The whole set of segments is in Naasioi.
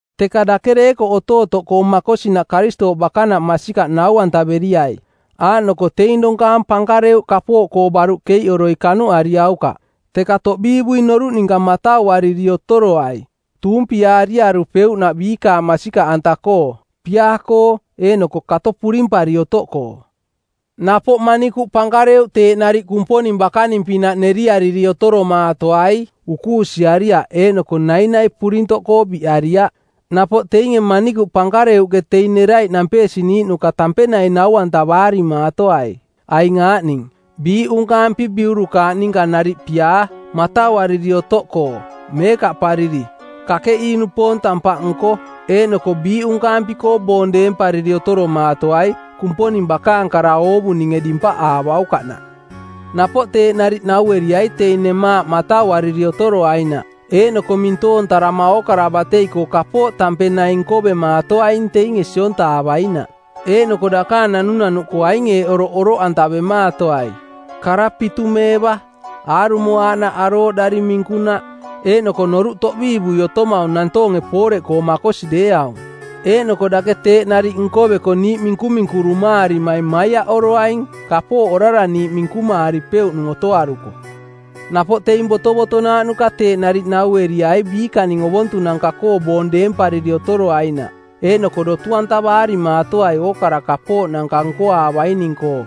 Teka dake deekoꞌ otootoꞌkoo makosinaꞌ Karistooꞌ bakanaꞌ masikaꞌ nau-antaveriai. Aaꞌnoko teing donkaang pankareuꞌ kapooꞌkoo baruꞌ keiꞌoroi kanuꞌariaukaꞌ, teka toꞌbiivui noruꞌ ninka matauariri otoroai, tuumpiaariarupeuꞌnaꞌ biikaang masikaꞌanta-koo, piaa-koo eeꞌnoko kato purimpari otoꞌkoo. Napoꞌ manikuꞌ pankareuꞌ teeꞌ nariꞌ Kumponing bakaning-pinaꞌ neriariri otoromaatoai, ukuusiariaꞌ eeꞌnoko nainai purintoꞌkoo biꞌariaꞌ. Napoꞌ teinge manikuꞌ pankareuꞌke teing neraiꞌ nampeesiniiꞌnuka tampeng naing nau-antavaarimaatoai, aing aaꞌning: Biiꞌunkaampi biurukaaꞌ ninka nariꞌ piaa, matauariri otoꞌkoo, meekaꞌpariri, kakeꞌii-nupoong tampaꞌnko, eeꞌnoko biiꞌunkaampi-koo boong deempariri otoromaatoai, Kumponing bakaang kara oovuninge dimpaꞌaavaukaꞌnaꞌ. Napoꞌ teeꞌ nariꞌ naueriai teing nemaaꞌ matauariri otoroainaꞌ. Eeꞌnoko mintoontarama ookara batei-koo kapooꞌ tampeng naing nkovemaatoaing teinge siontaavainaꞌ, eeꞌnoko dakaang naunau-koo aing eeꞌ oroꞌ oroꞌantavemaatoai: kara pitumeeva, aarumo aaꞌnaꞌ arooꞌdari minkunaꞌ, eeꞌnoko noruꞌ toꞌbiivui otomaung nantoonge pooreꞌkoo makosi deeaung. Eeꞌnoko dake teeꞌ nariꞌ nkoveko niiꞌ minkuminkurumaarimaing maiaꞌoroaing, kapooꞌ orara niiꞌ minkumaaripeuꞌnung otoaruko. Napoꞌ teing botovotonaaꞌnuka teeꞌ nariꞌ naueriai biikaning ovontunanka-koo boong deempariri otoroainaꞌ, eeꞌnoko dotu-antavaarimaatoai ookara kapooꞌnanka nkoaavaining-koo,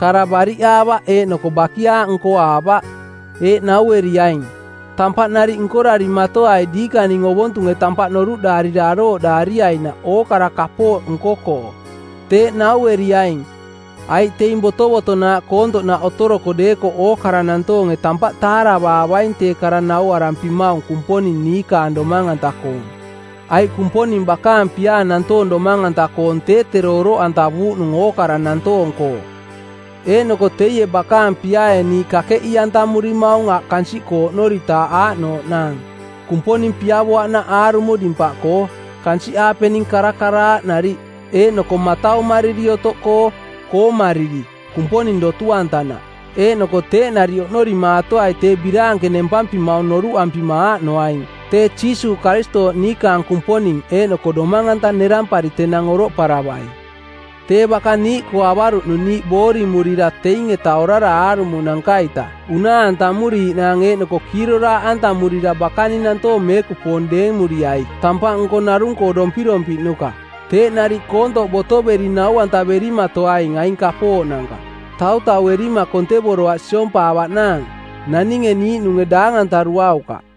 kara bariꞌaavaꞌ eeꞌnoko bakiaaꞌ nkoaavaꞌ. Eeꞌ naueriaing, “Tampaꞌ nariꞌ nkorarimatoai diikaning ovontunge tampaꞌ noruꞌdaarira arooꞌdaariainaꞌ ookara kapooꞌ nko-koo.” Teeꞌ naueriaing, aiꞌ teing botovotonaaꞌ koontoꞌnaꞌ otoroko deekoꞌ ookara nantoonge tampaꞌ taaravaavaing tee kara nauarampimaung Kumponing niikaang domang-anta-koong. Aiꞌ Kumponing bakaang piaa nantoong domang-anta-koong tee tero oroꞌantavuuꞌnung ookara nantoong-koo. Eeꞌnoko teie bakaang piaae niiꞌ kakeꞌii-antamurimaung aꞌ kansiꞌkoo oꞌnoritaaꞌ aaꞌnooꞌnaang: Kumponing piavoaꞌnaꞌ aarumo dimpaꞌkoo, kansiꞌaapening karakaraaꞌ nariꞌ, eeꞌnoko mataumariri otoꞌkoo, koomariri, Kumponing dotu-antanaꞌ. Eeꞌnoko teeꞌ nariꞌ oꞌnorimaatoai tee biraanke nempampimaung noruꞌampima aaꞌnoaing: tee Jiisuuꞌ Karistooꞌ niikaang Kumponing eeꞌnoko Domang-anta nerampari tenang oroꞌparavai. Tee baka niiꞌkoo avaruꞌnung niiꞌ boorimurira teing-eta orara aarumonanka-ita unaa-antamuriiꞌnaang eeꞌnoko kiiroraaꞌantamurira bakaning nantoong meekupoong deemuriai tampaꞌnko narung-koo dompirompiꞌnuka. Teeꞌ nariꞌ koontoꞌ botoveri nau-antaverimatoaing aing kapooꞌnanka, tautauerima kontevoroaꞌ siompaavaꞌnaang. Naninge niiꞌnunge daang-antaruaukaꞌ.